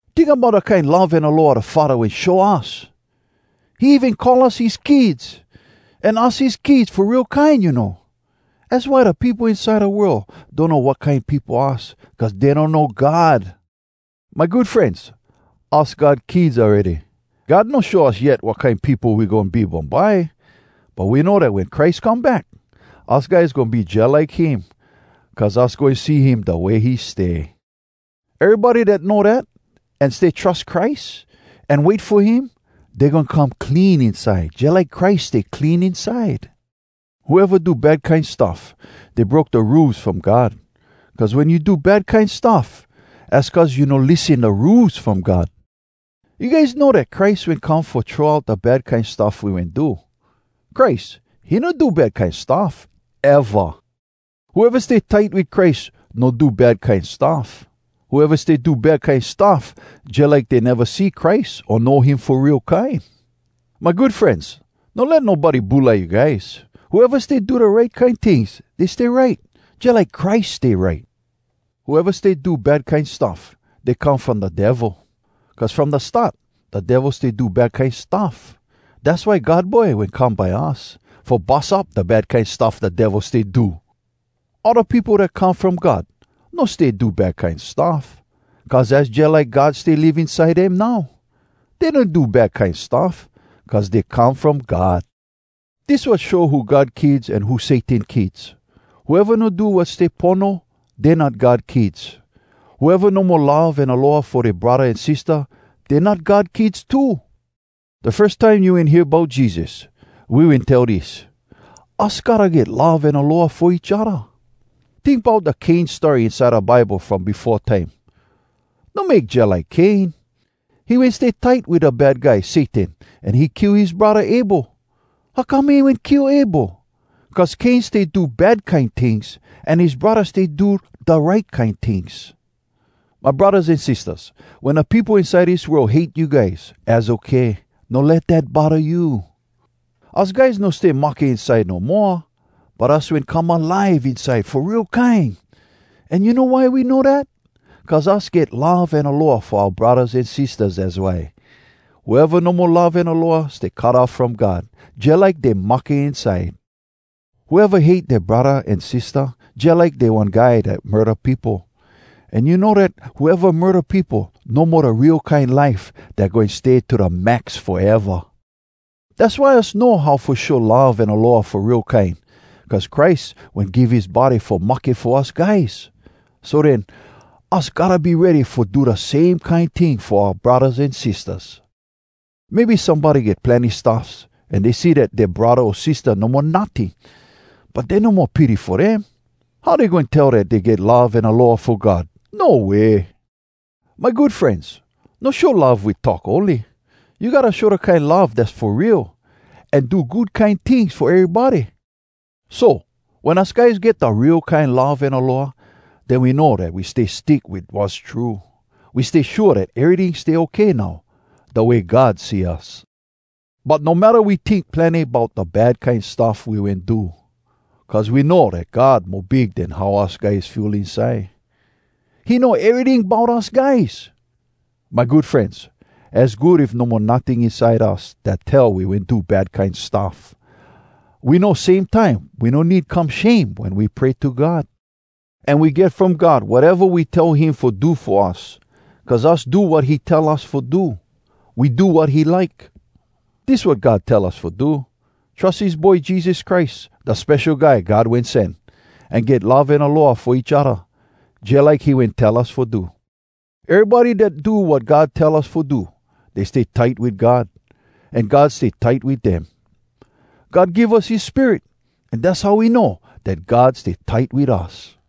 Tink bout da kine love an aloha da Faddah wen show us! He even call us his kids! An us his kids fo real kine, you know. Az why da peopo inside da world donno wat kine peopo us, cuz dey donno God. My good frenz, us God kids awready. God no show us yet wat kine peopo we goin be bumbye. But we know dat wen Christ come back, us guys goin be jalike him, cuz us goin see him da way he stay. Erybody dat know dat, an stay trus Christ, an wait fo him, dey goin come clean inside, jalike Christ stay clean inside. Whoeva do bad kine stuff, dey broke da Rules From God, cuz wen you do bad kine stuff, az cuz you no lissen da Rules From God. You guys know dat Christ wen come fo throw out da bad kine stuff we wen do. Christ, he no do bad kine stuff, eva! Whoeva stay tight wit Christ no do bad kine stuff. Whoeva stay do bad kine stuff, jalike dey neva see Christ o know him fo real kine. My good frenz, no let nobody bulai you guys. Whoeva stay do da right kine tings, dey stay right, jalike Christ stay right. Whoeva stay do bad kine stuff, dey come from da Devil. Cuz from da start, da Devil stay do bad kine stuff. Dass why God Boy wen come by us, fo bus up da bad kine stuff da Devil stay do. All da peopo dat come from God no stay do bad kine stuff, cuz az jalike God stay live inside dem now. Dey no do bad kine stuff, cuz dey come from God! Dis wat show who God kids an who Satan kids: whoeva no do wat stay pono, dey not God kids. Whoeva no mo love an aloha fo dea braddah an sistah, dey not God kids too! Da firs time you wen hear bout Jesus, we wen tell dis: Us gotta get love an aloha fo each odda. Tink bout da Cain story inside da Bible from befo time. No make jalike Cain. He wen stay tight wit da Bad Guy, Satan, an he kill his braddah Abel. How come he wen kill Abel? Cuz Cain stay do bad kine tings, an his braddah stay do da right kine tings. My braddahs an sistahs, wen da peopo inside dis world hate you guys, az okay, no let dat bodda you. Us guys no stay mahke inside no moa, but us wen come alive inside fo real kine! An you know why we know dat? Cuz us get love an aloha fo oua braddahs an sistahs, az why. Whoeva no mo love an aloha stay cut off from God, jalike dey mahke inside. Whoeva hate dea braddah an sistah, jalike dey one guy dat murda peopo. An you know dat whoeva murda peopo no mo da real kine life dat goin stay to da max foeva! Dass why us know how fo show love an aloha fo real kine: cuz Christ wen give his body fo mahke fo us guys! So den, us gotta be ready fo do da same kine ting fo oua braddahs an sistahs. Maybe somebody get plenny stuffs, an dey see dat dea braddah o sistah no mo notting, but dey no mo pity fo dem. How dey goin tell dat dey get love an aloha fo God? No way! My good frenz, no show love wit talk ony. You gotta show da kine love dass fo real, an do good kine tings fo erybody! So, wen us guys get da real kine love an aloha, den we know dat we stay stick wit wass true. We stay shua dat eryting stay okay now, da way God see us. But no matta we tink plenny bout da bad kine stuff we wen do. Cuz we know dat God mo big den how us guys feel inside. He know eryting bout us guys! My good frenz. Az good if no mo notting inside us dat tell we wen do bad kine stuff. We know same time we no need come shame wen we pray to God. An we get from God wateva we tell him fo do fo us, cuz us do wat he tell us fo do. We do wat he like. Dis wat God tell us fo do: Trus his Boy Jesus Christ, da Spesho Guy God Wen Sen, an get love an aloha fo each odda, jalike he wen tell us fo do. Erybody dat do wat God tell us fo do, dey stay tight wit God. An God stay tight wit dem. God give us his Spirit, an dass how we know dat God stay tight wit us.